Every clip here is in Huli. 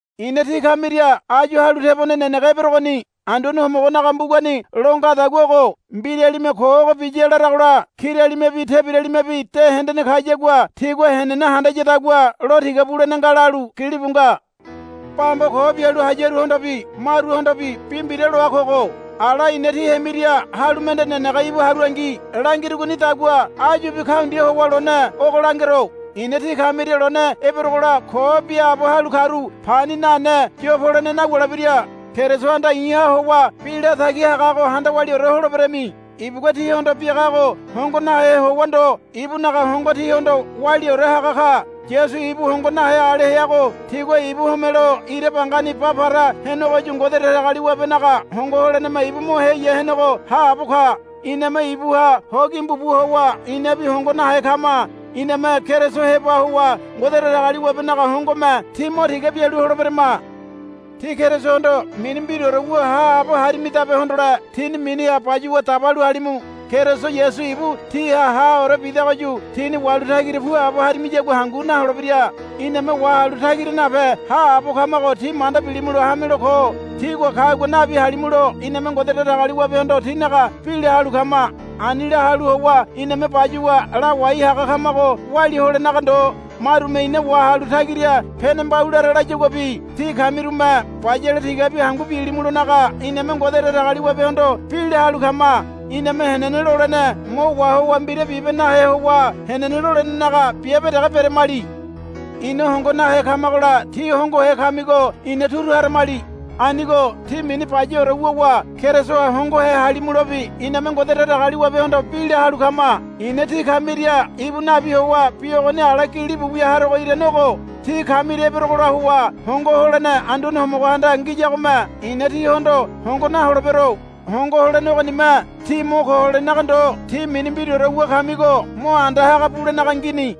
I̱na tí kamiria áyu halu tebone nenege eberogoni. Anduane Homogonaga mbugani lo ngadagua ogo, Mbiralime ko ogo biya, laragola kiralimebi tebiralimebi de hendene kayagua tigua henene handayadagua lo tiga bulene nga, lalu gilibu nga. Bamba ko bialu hayaruhondobi maruhondobi bi mbira loa kogo. Ala i̱na tí hemiria halu mende nenege íbu haruangi langirugonidagua áyubi kaundia howa lone ogo langero. I̱na tí kamiria lone eberogola ko biaabo halu karu pani nane yo polene nawulebira. Kerisohanda i̱ha howa bi latagi hagago handa waliaore holeberami. Ibugua tíhondo biagago hongo nahe howa ndo ibunaga hongo tíhondo waliaore haga ka. Yasu ibu hongo nahe ale heago tigua ibu homelo ira bangani ba para henegoyu Ngode Datagaliwabenaga hongo holeneme ibu mo heya henego haabo ka. Iname ibuha ho gimbu bu howa inabi hongo nahe kama. Iname Keriso heba howa Ngode Datagaliwabenaga hongome tí mo tiga bialu holeberama. Tí Kerisohondo mini mbiraore wu haabo harimidabe hondole tíni miniha bayuwa dabalu halimu. Keriso Yasu ibu tíha haore bidagoyu tíni wahalu tagira puabo harimiyagua hangu naholebira. Iname wahalu tagira nape haabo kamago tí manda bilimulo hamelo ko. Tígua kagua nabi halimulo iname Ngode Datagaliwabehondo tínaga bi la halu kama. Ani la halu howa iname bayuwa lawai haga kamago walia holenaga ndo marume ina wahalu tagira pene mbaulara layaguabi tí kamirume bayale tigabi hangu bilimulonaga iname Ngode Datagaliwabehondo bi la halu kama. Iname henene lolene mo wahowa mbira biabe bibe nahe howa henene lolenenaga biabe dege beramali. Ina hongo nahe kamagola tí hongohe kamigo ina turu haramali. Anigo tí mini bayaore wuwa Kerisoha hongohe halimulobi iname Ngode Datagaliwabehondo bi la halu kama. I̱na tí kamiria íbu nabi howa bi ogoni ala gilibu wia harogo irane ogo. Tí kamiria eberogola howa hongo holene Anduane Homogohanda ngiyagome i̱na tíhondo hongo naholebero. Hongo holene ogonime tí mo ko holenaga ndo tí mini mbiraore wu kamigo mo anda haga bulenaga ngini.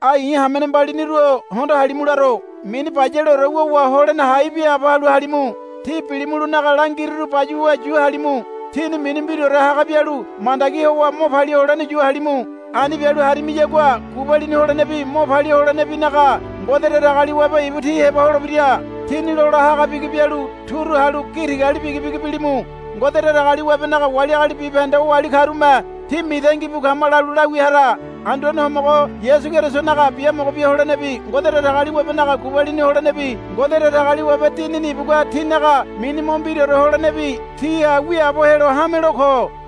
Ai i̱ hamene mbaliniru-o hondo halimu laro. Mini bayaleore wuwa holene hai biaabo halu halimu. Tí bilimulonaga langiruru bayuwa yu halimu. Tíni mini mbiraore haga bialu mandagi howa mo palia holene yu halimu. Ani bialu harimiyagua gubalini holenebi mo palia holenebinaga Ngode Datagaliwabe ibu tí heba holebira. Tini lola haga bigi bialu turu halu gi tigali bigibigi bilimu. Ngode Datagaliwabenaga wali agali bibahende oali karume, Tí mitangi bu kama, lalu la wia hara. Anduane Homogo Yasu Kerisonaga biamogo bia holenebi Ngode Datagaliwabenaga gubalini holenebi Ngode Datagaliwabe Dinini ibugua tínaga mini mo mbiraore holenebi tíha wiaabo helo hamelo ko.